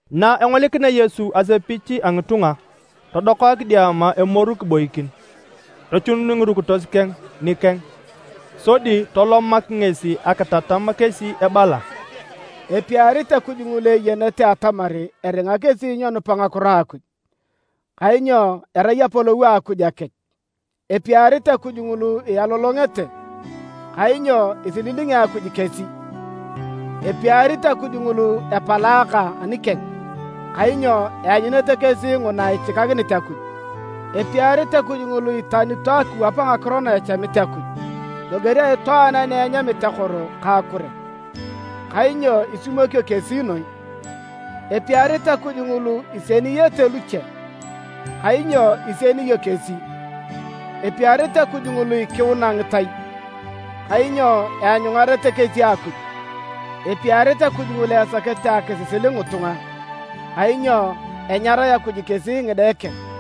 Na engolikinea Yesu asepich a ngitunga, todoka kidiama emoru kiboikin. Tochunun ngirukitos keng nikeng sodi tolomak ngesi akitatam kesi ebala: “Epiarit Akuj ngulu eyenete atamar eringa kesi nyenupa ngakiro a Akuj. Kainyo erai Apolou a Akuj akech. Epiarit Akuj ngulu ialolongete. Kainyo isililingi Akuj kesi. Epiarit Akuj ngulu epalaaka anikeng. Kainyo eanyunete kesi nguna ichikakinit Akuj. Epiarit Akuj ngulu iitanito akiwap ngakiro na echamit Akuj, loger a itwaan ani enyamit akoro ka akure. Kainyo isimwonio kesi noi. Epiarit Akuj ngulu isieniyenete luche. Kainyo isienio kesi. Epiarit Akuj ngulu ikiuna ngitai. Kainyo eanyungarete kesi Akuj. Epiarit Akuj ngulu esakete akisisil ngitunga. Kainyo enyarae Akuj kesi ngide keng.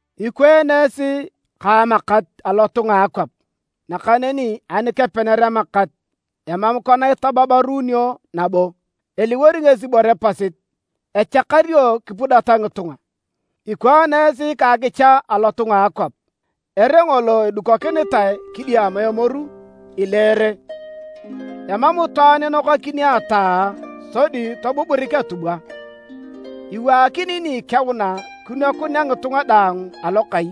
“Ikwaan esi ka amakat alotunga a akwap. Nakaneni ani kepener amakat, emam kona itababaruunio nabo. Eliwor ngesi ibore pasit, echakario kipudata ngitunga. “Ikwaan esi ka akicha alotunga a akwap. Ere ngolo edukokinitae kidiama emoru, ileere. Emam itwaan inokakini ataa sodi tobuburik atubwa. Iwaakinio ni ikeuna kinwakunea ngitunga daang alokai.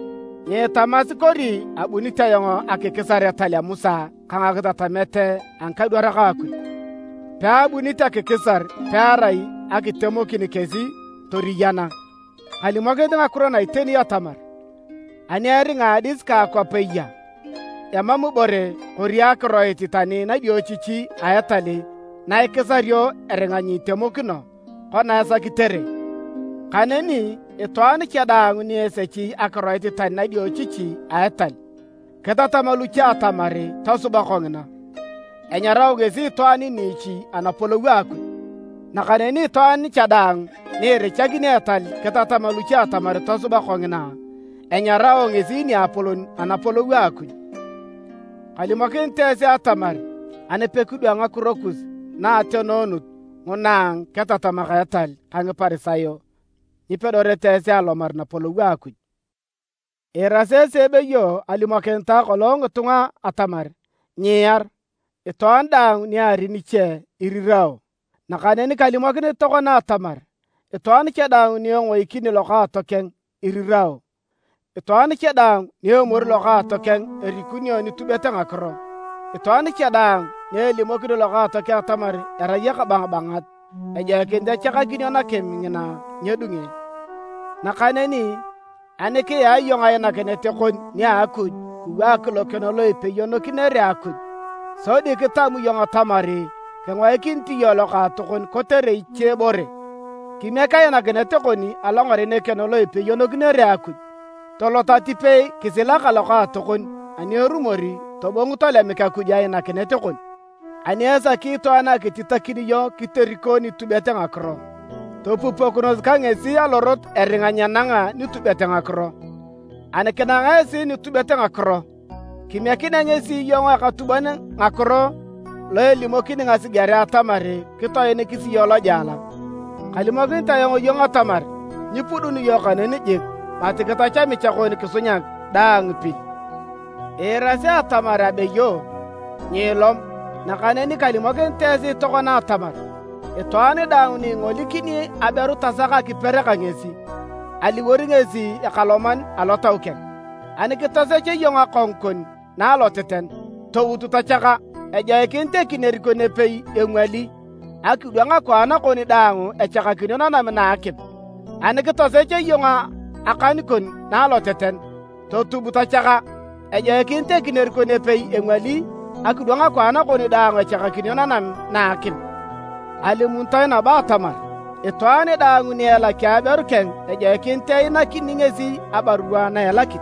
“Nyiitamasi kori abunit ayong akikisar etal a Musa ka ngakitatamet a ngikadwarak a Akuj. Peabunit akikisar pearai akitemokin kesi toriyana. Kalimokinit ngakiro na iteni atamar, ani eringa adis ka akwap eya, emam ibore kori akiroit tani nadiochichi a etal na ikisario eringa nyitemokino kona esakitere. Kaneni, itwaan cha daang ni esechi akiroit tani nadiochichi a etal, kitatam luche atamar tosuba kongina, enyarao ngesi itwaan niichi Anapolou a Akuj. Nakaneni itwaan cha daang ni irichakini etal kitatam luche atamar tosuba kongina, enyarao ngesi niapolon Anapolou a Akuj. Kalimokinit esi atamar ani pekidwang ngakiro kus na a ateneanut nguna a ngiketatamak a etal ka Ngiparisayo, nyipedorete esi alomar Napolou a Akuj. “Iirasi esi ebeyo alimokinitae kolong ngitunga atamar, ‘Nyiiar. Itwaan daang ni eari niche irirao’. Nakaneni kalimokinit tokona atamar, itwaan cha daang ni engoikini lokaatokeng irirao. Itwaan cha daang ni emori lokaatokeng erikunio nitubet ngakiro. Itwaan cha daang ni elimokini lokaatokeng atamar erai ekabangabangat, ejoikinit echakakinio nakim ngina nyedunge. Nakaneni ani kiyaa iyong ainakinet kon nia Akuj kiwaak lokeno lo ipeyonokinere Akuj, sodi kitam iyong atamar kingoikinit iyong lokaatokon kotere ichebore, kimiek ainakinet kon alongaren ekeno lo ipeyonokinere Akuj. Tolot atipei kisila ka lokaatokon ani erumor tobong tolemik Akuj ainakinet kon. “Ani esaki itwaan akititakin iyong kiteriko nitubet ngakiro, topupokinos ka ngesi alorot eringa nyenanga nitubet ngakiro. Ani kinanga esi nitubet ngakiro, kimiekinea ngesi iyong ekatubon ngakiro lo elimokini ngasigerea atamar kitoinikis iyong lojela. Kalimokinit ayong iyong atamar, nyipuduni iyong kaneni jik, mati kitach amicha kon kisunyak daang pil. “Iirasi atamar abeyo, ‘Nyiilom’. Nakaneni kalimokinit esi tokona atamar, itwaan daang ni ingolikini aberu tasak akiper ka ngesi, aliwor ngesi ekaloman alotau keng. Ani kitosech iyong akongu kon na aloteten, tout tochaka. Ejoikinit ekinier kon epei engwali, akidwang akwaan kon daang echakakinio nanam na a akim. Ani kitosech iyong akan kon na aloteten, totub tochaka. Ejoikinit ekinier kon epei engwali akidwang akwaan kon daang echakakinio nanam na a akim. “Alimunitoe nabo atamar, ‘Itwaan daang ni elaki aberu keng ejoikinit einakini ngesi abarua a elakit.’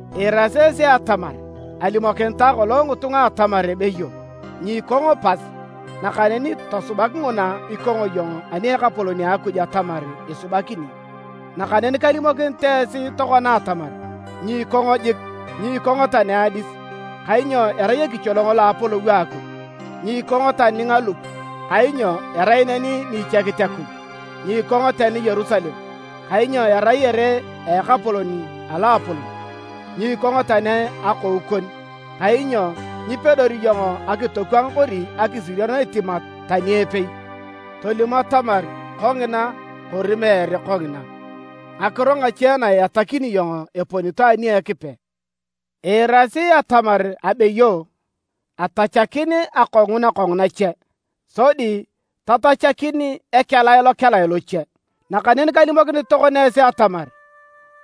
“Iirasi esi atamar alimokinitae kolong ngitunga atamar ebeyo, ‘Nyiikong pas, nakaneni tosubak nguna ikong iyong ani a Ekapolon Akuj atamar isubakini’. Nakaneni kalimokinit esi tokona atamar, nyiikongo jik. Nyiikongo tani adis, kainyo erai ekicholong lo Apolou a Akuj. Nyiikongo tani ngalup, kainyo erai neni ichiekit Akuj. Nyiikongo tani Yerusalem, kainyo erai ere a Ekapolon a loapolon. Nyiikongo tani akou kon, kainyo nyipedori iyong akitokwang kori akisirion etimat tani epei. Tolim atamar: ‘Kongina’ kori ‘Meere kongina’. Ngakiro ngache na iatakini iyong eponito ani a Ekipe. “Iirasi atamar abeyo: ‘Etachakin akongu nakongu nache, sodi totachakin ekelae lokelae loche’. Nakaneni kalimokinit tokona esi atamar,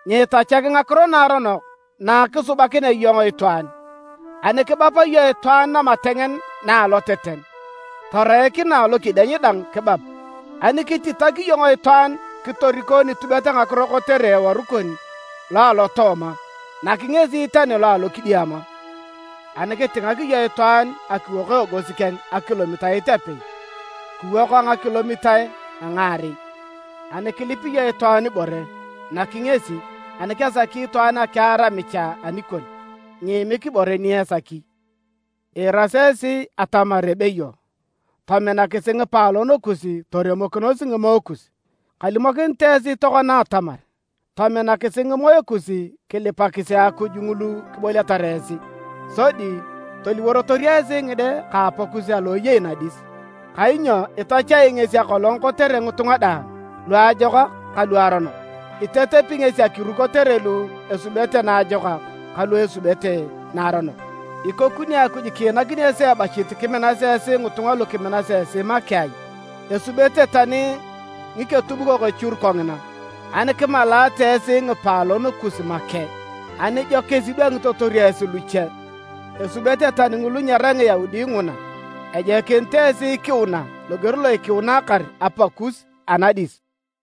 nyiitachak ngakiro naaronok na kisubakinea iyong itwaan. Ani kibap iyong itwaan namatengen na aloteten, toreik na alokedieny dang kibap. Ani kititak iyong itwaan kitoriko nitubet ngakiro kotere eworu kon lo alotooma, nak ngesi tani lo alokidiama. Ani kitingak iyong itwaan akiwok eegos keng a akilomitait a apei, kiwok a ngakilomitae a ngaarei. Ani kilip iyong itwaan ibore, nak ngesi. Ani kesaki itwaan akiar amicha anikon, nyiimik ibore ni esaki. “Iirasi esi atamar abeyo, ‘Tominakisi ngipaalon kus toremokinos ngimoe kus’. Kalimokinit esi tokona atamar: tominakisi ngimoe kus kilipakisi Akuj ngulu kiboliatar esi. Sodi toliworotor esi ngide ka Apakus alo eyei nadis. Kainyo itachai ngesi akolong kotere ngitunga daang, luajokak ka luaronok. Itetepi ngesi akiru kotere lu esubete naajokak ka lu esubete naaronok. Ikokini Akuj kiinakini esi ebachit kiminasi esi ngitunga lukiminasi esi make ai? Esubete tani ngiketubukok echur kongina. Ani kimalaate esi ngipaalon kus make, anijokis idwangitotor esi luche? Esubete tani ngulu nyerai Ngiyaudi nguna. Ejoikinit esi ikiuna loger lo ikiunakar Apakus anadis!